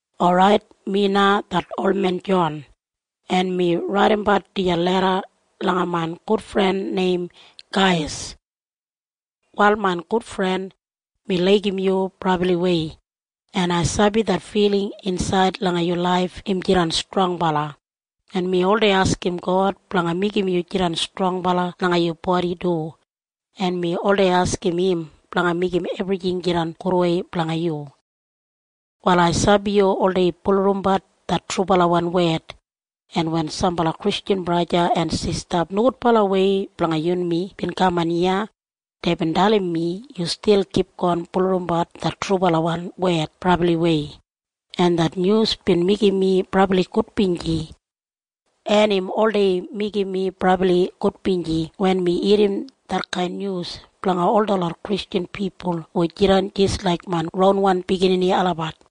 Orait, mi na det olmen Jon, en mi raidimbat dijan leda langa main gudfren neim Gaiyas. Prayer Wal main gudfren, mi laigim yu brabliwei, en ai sabi det filing insaid langa yu laif im jidan strongbala, en mi oldei askim God blanga meigim yu jidan strongbala langa yu bodi du, en mi oldei askim im blanga meigim ebrijing jidan gudwei blanga yu. Wal ai sabi yu oldei bulurrumbat det trubalawan wed, en wen sambala Kristjan braja en sista blanga yunmi bin kaman iya, deibin dalim mi yu stil kipgon bulurrumbat det trubalawan wed brabliwei, en det nyus bin meigim mi brabli gudbinji. En im oldei meigim mi brabli gudbinji wen mi irrim detkain nyus blanga ol detlot Kristjan pipul hu jidan jis laik main ronwan biginini olabat.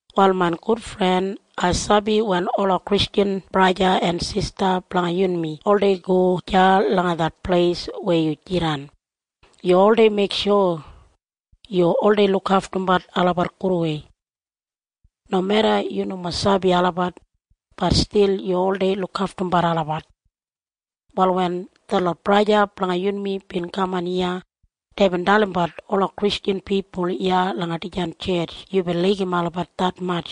Wal main gudfren, ai sabi wen ola Kristjan braja en sista blanga yunmi oldei go deya langa det pleis weya yu jidan, yu oldei meiksho yu oldei lukaftumbat olabat gudwei. Nomeda yu nomo sabi olabat, bat stil yu oldei lukaftumbat olabat. Wal wen detlot braja en sista blanga yunmi bin kaman iya, deibin dalimbat ola Kristjan pipul iya langa dijan tjetj yubin laigim olabat detmatj.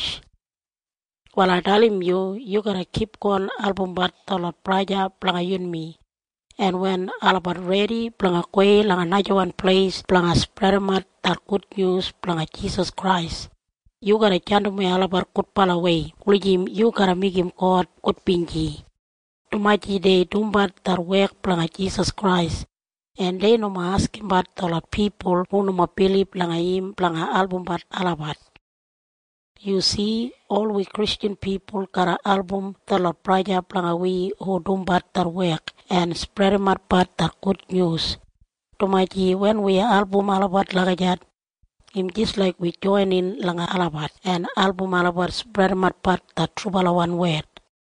Wal ai dalim yu. Yu garra kipgon albumbat detlot braja blanga yunmi, en wen olabat redi blanga gowei langa najawan pleis blanga spredimat det gudnyus blanga Jisas Krais, yu garra jandimwei olabat gudbalawei wulijim yu garra meigim God gudbinji, dumaji dei dumbat det wek blanga Jisas Krais, en dei nomo askimbat detlot pipul hu nomo bilib langa im blanga albumbat olabat. Yu si? Ol wi Kristjan pipul garra album detlot braja blanga wi hu dumbat det wek en spredimatbat det gudnyus, dumaji wen wi album olabat lagijat, im jis laik wi joinin langa olabat en album olabat spredimatbat det trubalawan wed.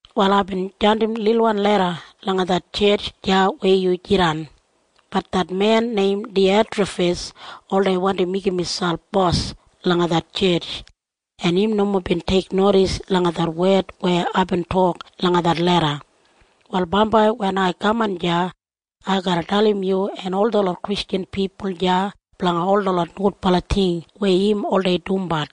Wal aibin jandim lilwan leda langa det tjetj deya weya yu jidan. Bat det men neim Diyatrafis oldei wandi meigim miselp bos langa det tjetj, en im nomo bin teiknodis langa det wed weya aibin tok langa det leda. Wal bambai wen ai kaman deya, ai garra dalim yu en ol detlot Kristjan pipul deya blanga ol detlot nogudbala ting weya im oldei dumbat.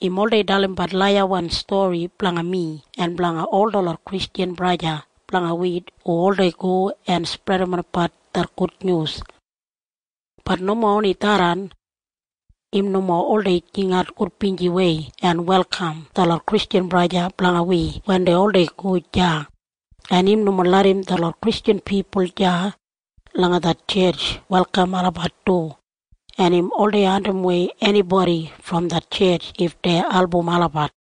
Im oldei dalimbat laiyawan stori blanga mi en blanga ol detlot Kristjan braja blanga wi hu oldei go en spredimatbat det gudnyus. Bat nomo oni tharran. Im nomo oldei jingat gudbinjiwei en welkam detlot Kristjan braja blanga wi wen dei oldei go deya, en im nomo larram detlot Kristjan pipul deya langa det tjetj welkam olabat du, en im oldei andimwei enibodi brom det tjetj if dei album olabat.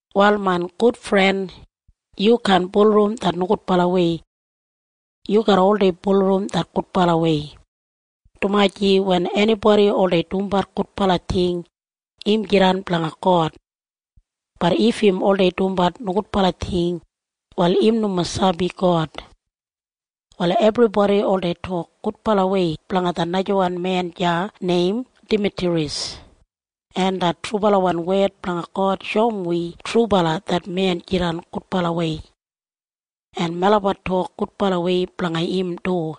Wal main gudfren, yu kaan bulurrum det nogudbalawei. Yu garra oldei bulurrum det gudbalawei, dumaji wen enibodi oldei dumbat gudbala ting, im jidan blanga God. Bat if im oldei dumbat nogudbala ting, wal im nomo sabi God. Wal ebribodi oldei tok gudbalawei blanga det najawan men deya neim Damitriyas, en det trubalawan wed blanga God shoum wi trubala det men jidan gudbalawei, en melabat tok gudbalawei blanga im du,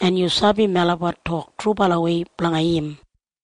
en yu sabi melabat tok trubalawei blanga im.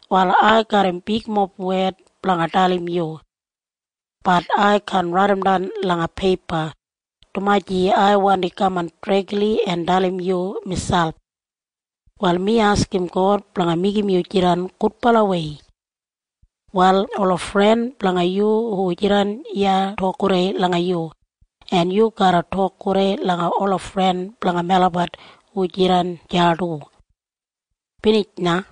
Wal ai garram bigmob wed blanga dalim yu. Bat ai kaan raidimdan langa peipa, dumaji ai wandi kaman dregli en dalim yu miselp. Wal mi askim God blanga meigim yu jidan gudbalawei. Wal ola fren blanga yu hu jidan iya tok gudei langa yu, en yu garra tok gudei langa ola fren blanga melabat hu jidan deya du. Binij na.